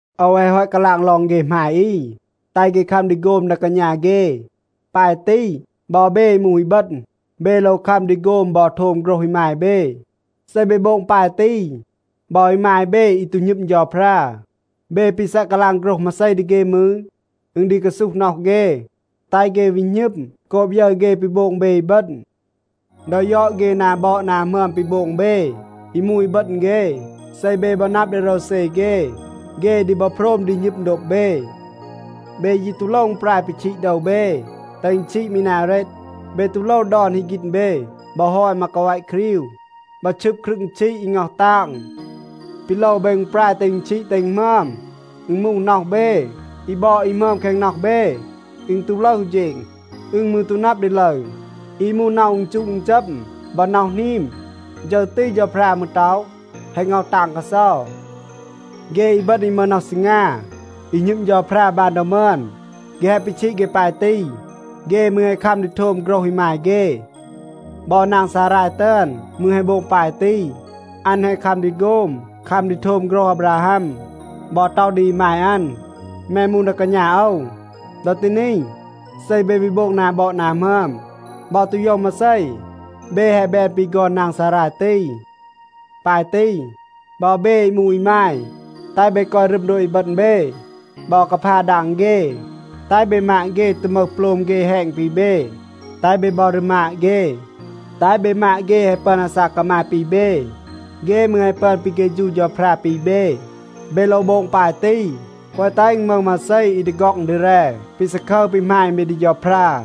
โอว แฮะ ฮอต กาลาง ลอง เฆ หมาย อี, แตห เฆ คัม ดี โฆม ดา กาณา เฆ. ปาย ตี, บอ เบ อี มูห อีบึณ, เบ โลว คัม ดี โฆม บอ โทม โฆรห อีมาย เบ. เซ เบ โบง ปาย ตี, บอ อีมาย เบ อี ตู หณึม เฌาพรา, เบ ปี ซัะ กาลาง โฆรห มาเซ ดี เฆ มืร, อึณ ดี กาซูห น็อห เฆ, แตห เฆ วี หณึม โกบ ยึร เฆ ปี โบง เบ อีบึณ. ดอ ยอด เฆ นา บอด นา หมึอม ปี โบง เบ อี มูห อีบึณ เฆ, เซ เบ บอ นับ ดี โรวเซ เฆ, เฆ ดี บอ โพรม ดี หณึม โดบ เบ. เบ ยี ตู โลว อึณปราย ปีชีด โดว เบ, แตห อึณ ชีด มี นา เรต. เบ ตู โลว ดอน ฮึก ฆีณ เบ, บอ ฮอย มากาแวะ ครีว, บอ ชึบ ครึง ชีด อี ง็อห ตาง. ปี โลว เบ อึณปราย แตห อึณ ชีด แตห อึณ หมึอม, อึณ มูห น็อห เบ. อี บอด อี หมึอม แคง น็อห เบ, อึณ ตู ลึห อู เฌณ. อึณ มืร ตู นับ ดี ลึร. อี มูห น็อห อึณจูะ อึณจัม บอ น็อห หนีม, ฌึร ตี เฌาพรา มืร ต็อห, แฮะ ง็อห ตาง กาเซา. เฆ อีบึณ อี มึห น็อห ซีงา อี หณึม เฌาพรา บาน ดอ มึอน, เฆ แฮะ ปีชีด เฆ ปาย ตี. เฆ มืร แฮะ คัม ดี โทม โฆรห อีมาย เฆ. บอ นาง ซาราย ตึอน มืร แฮะ โบง ปาย ตี. อัน แฮะ คัม ดี โฆม, คัม ดี โทม โฆรห อาบราฮัม, บอ ต็อห ดี อีมาย อัน, “แม มูห ดา กาณา โอว.” ดอ ตี นี, เซ เบ วี โบง นา บอด นา หมึอม บอ ตู โยว มาเซ, เบ แฮะ แบน ปี ฆอน นาง ซาราย ตี. ปาย ตี, บอ เบ อี มูห อีมาย, แตห เบ กอย รึม โดบ อีบึณ เบ บอ กาพา ดาง เฆ. แตห เบ มาด เฆ ตู มึห โปลม เฆ แฮณ ปี เบ. แตห เบ บอ รีมาด เฆ. แตห เบ มาด เฆ แฮะ ปึอน อาซาก กามาย ปี เบ. เฆ มืร แฮะ ปึอน ปี เฆฌู เฌาพรา ปี เบ. เบ โลว โบง ปาย ตี, แกวะ แตห อึณ มึห มาเซ อี ดี ฆ็อง ดี แร ปี ซาคึร ปี หมาณ เบ ดี เฌาพรา.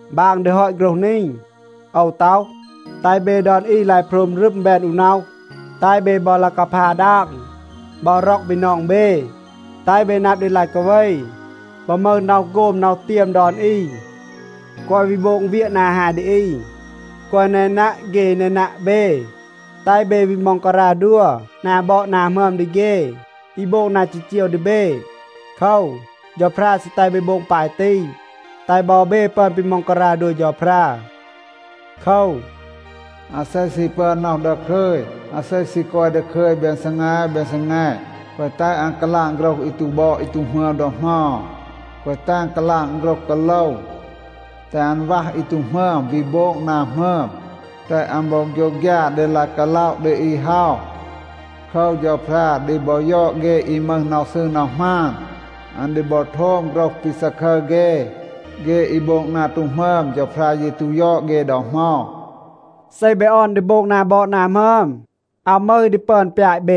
บาง ดี ฮอต โฆรห นี, โอว ต็อห, แตห เบ ดอน อี ลาย โพรม รึม, แบน อู น็อห. แตห เบ บอ ลาย กาพา ดาง, บอ ร็อก บีนอง เบ. แตห เบ นับ ดี ลาย กาเว บอ มึห น็อห โฆม น็อห เตียม ดอน อี. แกวะ วี โบง เวียะ นา ฮาย ดี อี. แกวะ แนนัะ เฆ อี แนนัะ เบ. แตห เบ วี ม็องการา ดัว นา บอด นา หมึอม ดี เฆ อี โบง นา จีจีว ดี เบ. โคว, เฌาพรา ซี แตห เบ โบง ปาย ตี. แตห บอ เบ ปึอน ปี ม็องการา ดัว เฌาพรา. โคว, อาเซ ซี ปึอน น็อห ดาคึย, อาเซ ซี กอย ดาคึย แบน ซีแง แบน ซีแง, แกวะ แตห อัน กาลาง โฆรห อี ตู บอด อี ตู หมึอม ดอ เหมา. แกวะ แตห อัน กาลาง โฆรห กาโลว. แตห อัน วัห อี ตู หมึอม, วี โบง นา หมึอม. แตห อัน บอ โฆยวฆยา ดี ลาย กาล็อะ ดี อี เฮา. โคว, เฌาพรา ดี บอ ยอด เฆ อี มึห น็อห ซืร น็อห หมาน. อัน ดี บอ โทม โฆรห ปี ซาคึร เฆ. เฆ อี โบง นา ตู หมึอม, เฌาพรา ยี ตู ยอด เฆ ดอ เหมา. เซ เบ ออน ดี โบง นา บอด นา หมึอม, อาว มึห อี ดี ปึอน ปยาต เบ.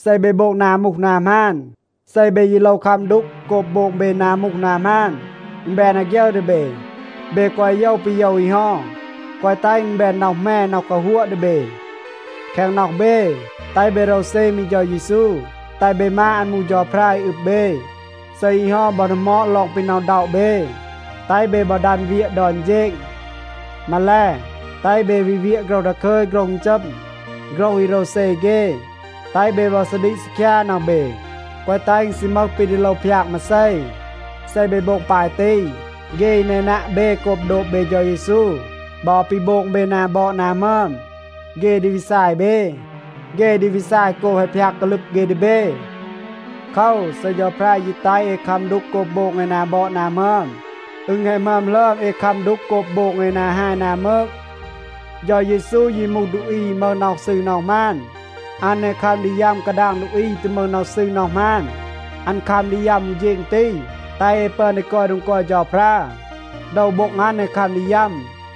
เซ เบ โบง นา มูห นา หมาน, เซ เบ ยี โลว คัม ดูก โกบ โบง เบ นา มูห นา หมาน, อึณ แบน อาฆยึร ดี เบ. เบ แกวะ โยว ปี โยว อี เฮา, แกวะ แตห อึณ แบน น็อห แหม, น็อห กาฮัวะ ดี เบ. แคง น็อห เบ, แตห เบ โรวเซ มี เฌา เยซู, แตห เบ มาด อัน มูห เฌาพรา อี อึบ เบ. เซ อี เฮา บอ ดีหมอด ลอง ปี หน็อะ อึณด็อะ เบ, แตห เบ บอ ดัน เวียะ ดอน เฌณ. มาแล, แตห เบ วี เวียะ โฆรห ดาคึย โฆรห อึณจัม, โฆรห อี โรวเซ เฆ. แตห เบ บอ ซาดีก ซีคยา น็อห เบ, แกวะ แตห อึณ ซี มึห ปี ดี โลว พยาก มาเซ. เซ เบ โบง ปาย ตี, เฆ อี แนนัะ เบ โกบ โดบ เบ เฌา เยซู บอ ปี โบง เบ นา บอด นา หมึอม, เฆ ดี วี ซาย เบ. เฆ ดี วี ซาย โกบ แฮะ พยาก กาลึบ เฆ ดี เบ. โคว, เซ เฌาพรา ยี แตห เอ คัม ดูก โกบ โบง เอ นา บอด นา หมึอม, อึณ แฮะ หมึอม หลึอม เอ คัม ดูก โกบ โบง เอ นา ฮาย นา มืก. เฌา เยซู ยี มูห ดูอี อี มึห น็อห ซืร น็อห หมาน, อัน แฮะ คัม ดี ยัม กาดาง ดูอี อี ตู มึห น็อห ซืร น็อห หมาน. อัน คัม ดี ยัม อู เฌณ ตี, แตห เอ ปึอน ดี กอย โดง กอย เฌาพรา. โดว โบ็ง อัน แฮะ คัม ดี ยัม,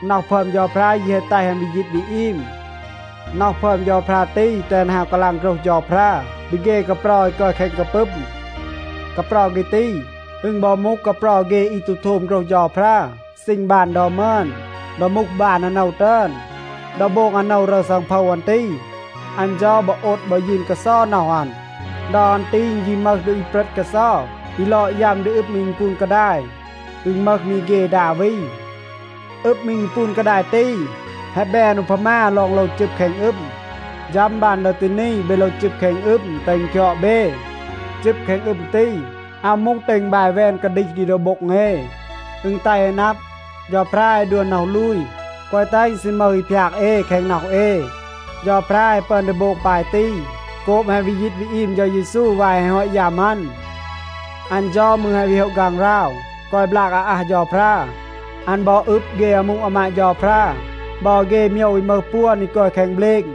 น็อห พึอม เฌาพรา ยี แฮะ แตห อัน วี ยีต วี อีม. น็อห พึอม เฌาพรา ตี, แตห อัน ฮาว กาลาง โฆรห เฌาพรา ดี เฆ กาเปรา อี กอย แคง กาปึม. กาเปรา เฆ ตี, อึณ บอ มูห กาเปรา เฆ อี ตู โทม โฆรห เฌาพรา ซีณ บาน ดอ มึอน, ดอ มูห บาน อาโนว ตึอน. ดอ โบง อาโนว รึร ซังโพว อัน ตี, อัน เฌา บอ โอด บอ ยืน กาเซา น็อห อัน. ดอ อัน ตี อึณ ยี มึห ดูอี เปรต กาเซา อี ลอด ยัม ดี อึม อี ปูน กาดาย. อึณ มึห มี เฆ ดา วี. อึม อี อึณปูน กาดาย ตี, แฮะ แบน อูพามา ลอง โลว จึบ แคง อึม. ฌัม บาน ดอ ตี นี เบ โลว จึบ แคง อึม, แตห อึณ คยอด เบ. จึบ แคง อึม ตี, อาว มูห แตห อึณ บาย แวน กาดีห ดี โดว โบ็ง เอ. อึณ แตห เอ นับ, เฌาพรา แฮะ ดัว น็อห ลูย, แกวะ แตห อึณ ซี มึห อี พยาก เอ แคง น็อห เอ. เฌาพรา แฮะ ปึอน ดี โบง ปาย ตี โกบ แฮะ วี ยีต วี อีม เฌา เยซู วาย แฮะ ฮอต ยัม อัน. อัน เฌา มืร แฮะ วี โฮะ ฆางหราว, กอย บลาก อาอัห เฌาพรา. อัน บอ อึบ เฆ อามู อามาด เฌาพรา, บอ เฆ โมยว อี มึห ปวน อี กอย แคง เบลณ,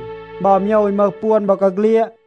บอ โมยว อี มึห ปวน บอกาเฆลียด.